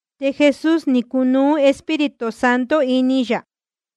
Te Jesús ni cunuú Espíritu Santo ini yā,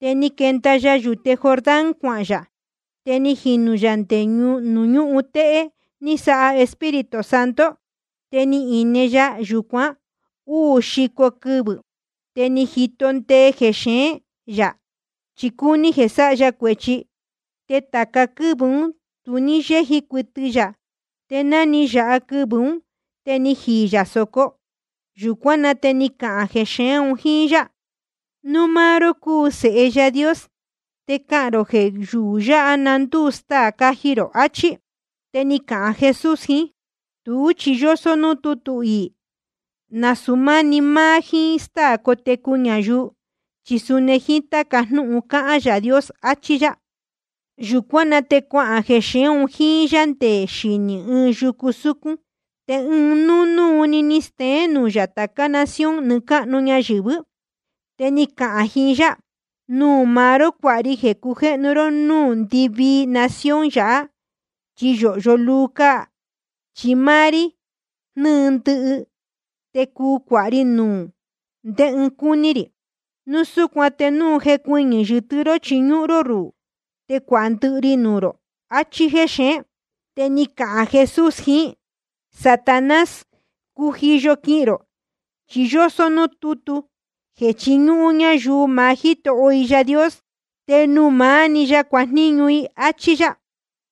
te ni quenda ya yūte Jordán cuahān yā. Te ni jinū yā nde nuū ñúhun téhé ní sáha Espíritu Santo. Te ni ine ya yūcuan úū xico quɨvɨ̄, te ni jito ndee jexeén yā, chi cúní jeē sáha ya cuēchi. Te tāca quɨ́vɨ̄ ún tu ní yéji cuɨtɨ yā, te ná ni yāha quɨvɨ̄ ún, te jíí yā sōco. Yūcuán na te ni cahān jexeén un jíín yá: Núu máá ró cúu Sēhe Yaā Dios, te cahān rō jeē yuū yáha na ndúu staā caji rō, achí. Te ni cahān Jesús jiín: Tuú chi yósó núū tútu iī: Nasūu máni máá jíín stáā cátecu ñayuu, chi suni jíín táca jnúhun cáhán Yaā Dios, achí yá. Yūcuán na te cuahān jexeén un jíín yá nde xinī ɨɨn yucu súcún, te ɨɨn núnúu‑ni ni steén nuū yā tācá nación nɨɨ́ cáhnu ñayɨ̄vɨ́. Te ni cahān jiín yá: Nuū maá ró cuāha ri jeē cujéhnu ró núū ndɨvii nación yáha, chi yōhyo luu cáa. Chi máá rí jnɨ́ɨ ndɨhɨ, te cuu cuāha ri nuū ndé ɨɨn cúní rī. Núu súcuan te núu cuɨñɨ yɨ́tɨ́ ró chiñúhún ró ruhū, te cuāha ndɨhɨ ri nuū rō. Achí jexeén. Te ni cahān Jesús jiín: Satanás, cujiyo quihīn rō, chi yósó núū tútu jeē chiñúhún ñayuu maá Jítoho i Yaā Dios, te nuū maá‑ni ya cuajníñu i. Achí yá.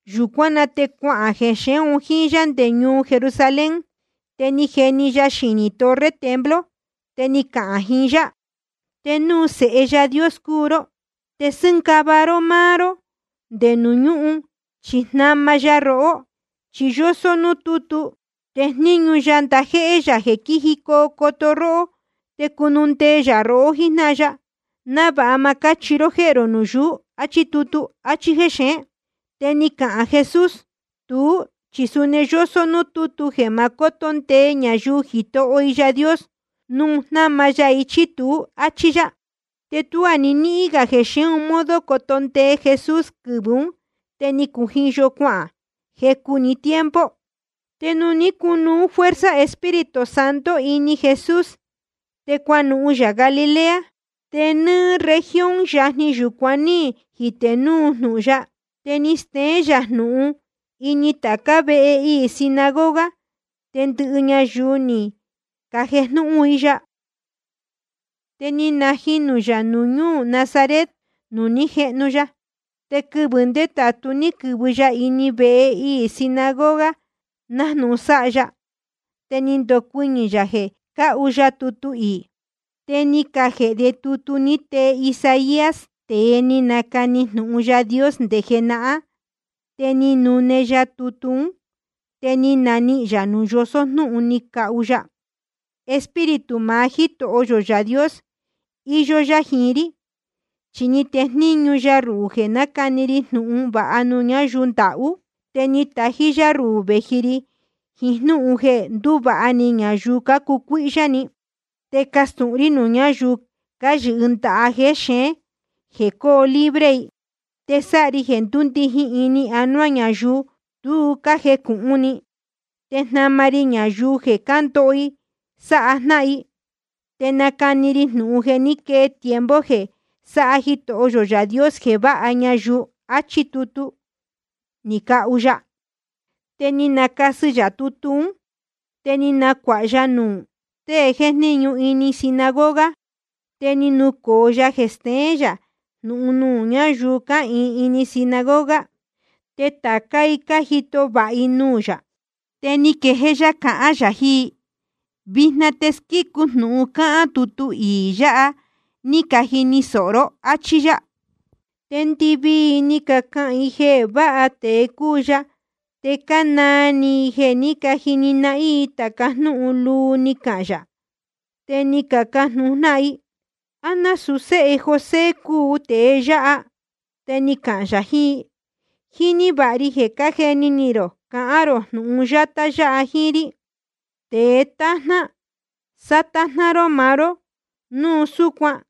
Yūcuán na te cuahān jexeén un jíín yá nde ñuu Jerusalén. Te ni jeni ya xinī torre templo. Te ni cahān jiín yá: Te núu Sēhe Yaā Dios cúu ró, te sɨ́ngava ró máá ró nde nuū ñúhun, chi jnama ya rohó. Chi yósó núū tútu: Tejníñu ya ndajéhé yā quijicoo coto róhó. Te cunundee yā rohó jíjnáhan ya, návāha ma cáchihi ró jéhē rō nuū yuú. Achí tutu. Achí jexeén. Te ni cahān Jesús: Tuú chi suni yósó núū tútu jeē ma cóto ndee ñayuu Jitoho i Yaā Dios, núu jnama ya i chí tuú, áchí yá. Te tuá ni níhín jexeén modo coto ndee Jesús quɨvɨ̄ ún, te ni cujiyo cuahān jecu‑ni tiempo. Te ni cunuú fuerza Espíritu Santo ini Jesús, te cuanuhun yā Galilea. Te nɨ́ɨ́ región yajni yūcuan ní jitē núu jnūhun ya. Te ni steén yā jnūhun ini tācá vehe iī sinagoga, te ndɨhɨ ñayuu ni cajejnúhún i ya. Te ni najinū yā ñuu Nazaret nuū ní jehnu ya. Te quɨvɨ̄ ndétātú ni quɨ̄vɨ ya ini vehe iī sinagoga, nájnūhun sáha sáha ya. Te ni ndocuɨñɨ̄ yā jeē cahu ya tutu iī. Te ni cajēhe de tutu ni tee Isaías, tēe ni nacani jnūhun Yaā Dios nde jenahán. Te ni nune ya tutu ún, te ni nanihīn yā nuū yosó jnúhun ni cahu ya: Espíritu maá Jítoho yō Yaā Dios iyó yá jiín rí, chi ni tejníñu ya ruhū jeē nácani ri jnūhun vāha nuū ñáyuu ndahú. Te ni tají yá ruhū vēji ri jiín jnúhun jeē ndúvāha ni ñayuu cácucuíhyá ni. Te castūhun rí nuū ñáyuu cáyɨhɨ ndaha jexeén jeē coo libre i. Te sáha ri jeē ndúndijin ini anuá ñayuu tu cájecūhun ni, te jnama ri ñayuu jeē cándoho i sáha jnáhan i. Te nacani ri jnūhun jeē ní quee tiempo jeē sáha Jitoho yō Yaā Dios jeē váha ñayuu. Achí tutu ni cahu ya. Te ni nacasɨ yā tutu ún, te ni nacuāha ya nuū tée jéjníñu ini sinagoga, te ni nucōo ya jeē steén yā jnūhun nuū ñáyuu cáhīin ini sinagoga. Te tācá i cájito vāha i nuū yā. Te ni quejéé yá cahán yā jiín i: Vijna te ni squícu jnūhun cáhán tutu iī yāha ní cajini sōho ró, áchí yá. Te ndɨvii i ni cacahān jeē váha tēe cúu ya, te cánaa ni i jeē ní cajini i tāca jnúhun luu ni cahān yā. Te ni cacajnūhun jnáhan i: ¿A násūu séhe José cúu tēe yáha? Te ni cahān yā jiín i: Jíní vāha ri jeē cájeni ni rō cahān rō jnūhun yátá yáha jíín rí: Tēe tájná, sátájná ró maá ró núu súcuan.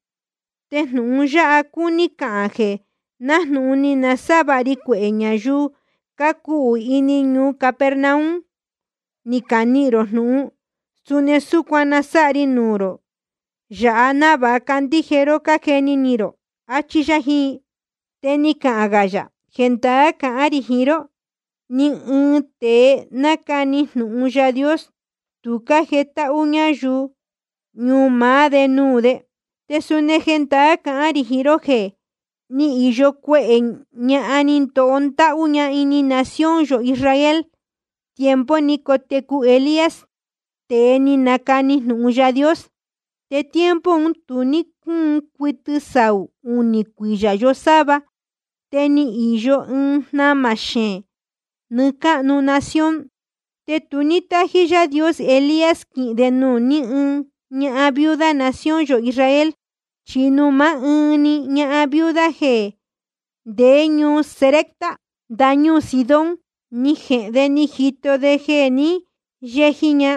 Te jnūhun yáha cúní cahān jeē nájnūhun ni nasávāha ri cuehē ñayuu cácuhū ini ñuu Capernaum ni canihīn rō jnūhun, suni súcuan na sáha ri ñuu yō yāhá návāha candíje ró cájeni ni rō. Achí yá jiín i. Te ni cahān gā yā: Jendaá cahán rī jiín ró, ni ɨɨn tēe nácani jnūhun Yaā Dios, tu cájetáhú ñayuu ñuu maá de nuū de. Te suni jendaá cahán rī jiín ró jeē ni íyo cuehē ñahan ní ndóo ndáhú ini nación yō Israel, tiempo ni cotecu Elías, tēe ni nacani jnūhun Yaā Dios. Te tiempo un tu ní cúun cuɨtɨ saū unī cuiyā yosáva, te ni īyo ɨɨn jnamā xeēn nɨɨ́ cáhnu nación. Te tu ní tájí Yaā Dios Elías quihīn de nuū ni ɨɨn ñahan viuda nación yō Israel, chi nuū máá ɨɨn‑ni ñahan viuda jeē ndeé ñuu Sarepta ndañúū Sidón, ni jehēn de ni jito de jeē ní yeji ña.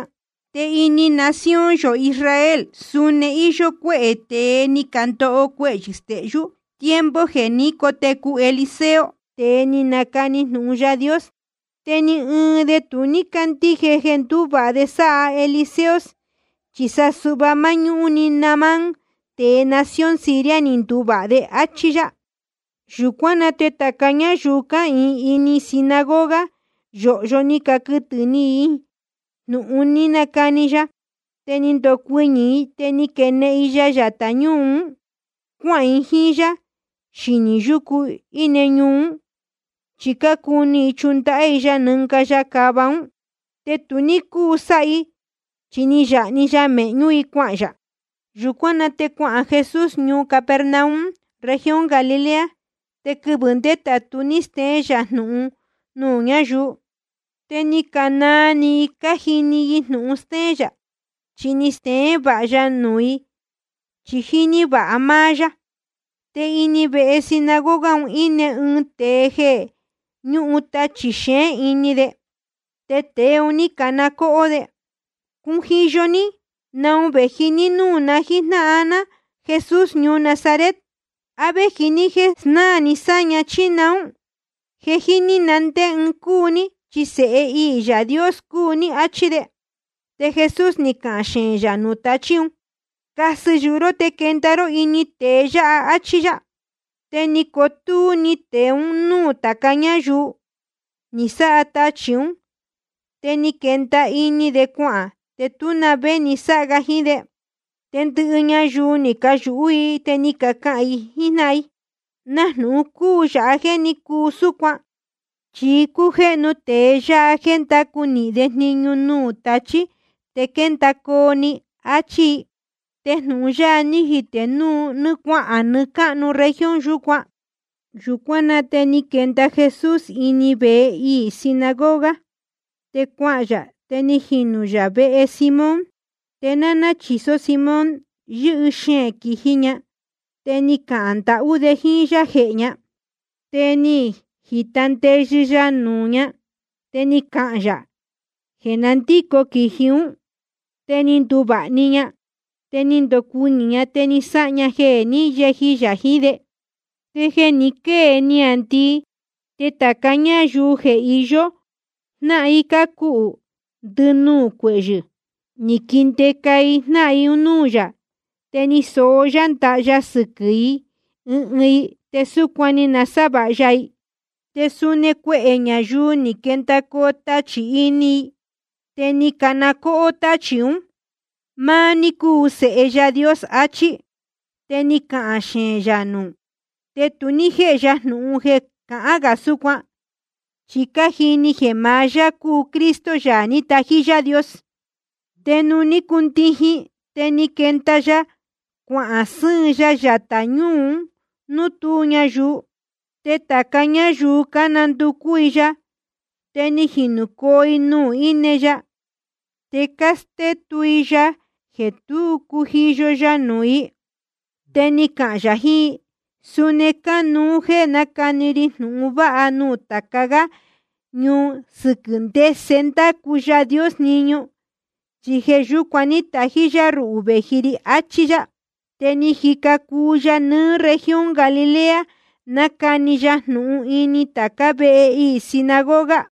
Te ini nación yō Israel suni ni īyo cuehē tēe ni candoho cuehyɨ̄ stehyú, tiempo jeē ní cotecu Eliseo, tēe ni nacani jnūhun Yaā Dios. Te ni ɨɨn de tu ní cándíje jeē ndúvāha de sáha Eliseo, chi sa suhva máñúhún‑ni Naamán, tēe nación Siria ni nduvāha. Achí yá. Yūcuán na te tāca ñáyuu cáhīin ini sinagoga, yōhyo ni caquɨtɨ̄ ni i jnūhun ní cahān yā. Te ni candocuɨñɨ̄ i, te ni caquenehen i ya yatā ñúū ún, cuahān i jíín yá xinī yúcu íne ñuu ún, chi cácuni i chundahá i ya nɨnga ya cava ún. Te tu ní cúu sáha i, chi ni yāha‑ni ya mēhñú i cuahān yā. Yūcuán na te cuahān Jesús ñuu Capernaum región Galilea. Te quɨvɨ̄ ndétātu ní steén yā jnūhun nuū ñáyuu. Te ni canaa ni i cájini i jnūhun stéén yā. Chi ni steén vāha ya nuū i, chi jíní vāha máá yá. Te ini vehe sinagoga un íne ɨɨn tēe jeē ñúhun tachī xeén ini de. Te tēe un ní cana cóhó de: Cujiyo ní. ¿Naun vēji ní núū na jíjnáhan ná, Jesús ñuu Nazaret? ¿A véji ní jéē snáā ni sáña, chí naún? Je jíní na ndé ɨɨn cúu ní, chi Sēhe iī Yaā Dios cúu ní. Achí de. Te Jesús ni cahān xeēn yā nuū tachī ún: Casɨ yuhu ró te quenda ró ini tēe yáha, áchí yá. Te ni cotúú‑ni tēe un núū tāca ñáyuu, ni sáha tachī ún. Te ni quenda ini de cuahān, te tú na vé ni sáha ga jiín de. Te ndɨhɨ ñayuu un ní cayūhú i, te ni cacahān i jíín jnáhan i: ¿Na jnūhun cúu yāha jéē ní cuu súcuan? Chi cújéhnu tēe yáha jéē ndácu nīhin de jniñu nuū tachí, te quéndacoo‑ni, áchí i. Te jnūhun ya ni jitē núu cuahān nɨɨ́ cáhnu región yūcuán. Yūcuán na te ni quenda Jesús ini vehe iī sinagoga, te cuahān yā te ni jinū yā vehe Simón. Te náná chīsó Simón, yɨ́hɨ xeēn quīji ña, te ni cacahān ndahú de jíín yá jehē ña. Te ni jīta ndeyɨ ya nuū ña, te ni cahān yā jeē na ndíco quīji ún. Te ni nduvāha‑ni ña. Te ni ndocuɨñɨ̄‑ni ña, te ni sáha ña jeē ní yeji yā jiín de. Te jeē ni quée niāndii, te tāca ñáyuu jeē iyó jnáhan i cácuhū ndɨnuū cuehyɨ̄, ni caquindeca i jnáhan i un núū yā. Te ni soó yá ndaha ya sɨquɨ̄ ɨɨn ɨɨn i, te súcuan ni nasávāha ya i. Te suni cuehē ñayuu ni quendacoo tachī ini i, te cácana cóhó táchī ún: Máá ní cúu Sēhe Yaā Dios, achí. Te ni cahān xeēn yā nuū, te tu ní jéhe ya jnūhun jeē cahán gā súcuan, chi cájini jeē maá yá cúu Cristo, Yaā ní tají Yaā Dios. Te nuū ní cundijin, te ni quenda ya cuahān sɨ́ɨn ya yatā ñúū nuū tú ñayuu. Te tāca ñáyuu cánanducú i ya, te ni jinūcoo i nuū íne ya. Te cástétu i ya jeē tú cujiyo ya nuū i. Te ni cahān yā jiín i: Suni cánuú jéē nacani ri jnūhun vāha nuū tāca gá ñuu sɨquɨ̄ ndese ndácu Yaā Dios jniñu, chi jeē yúcuan ní tají yá ruhū vēji ri. Achí yá. Te ni jica cuu ya nɨɨ́ región Galilea, nácani ya jnūhun ini tācá vehe iī sinagoga.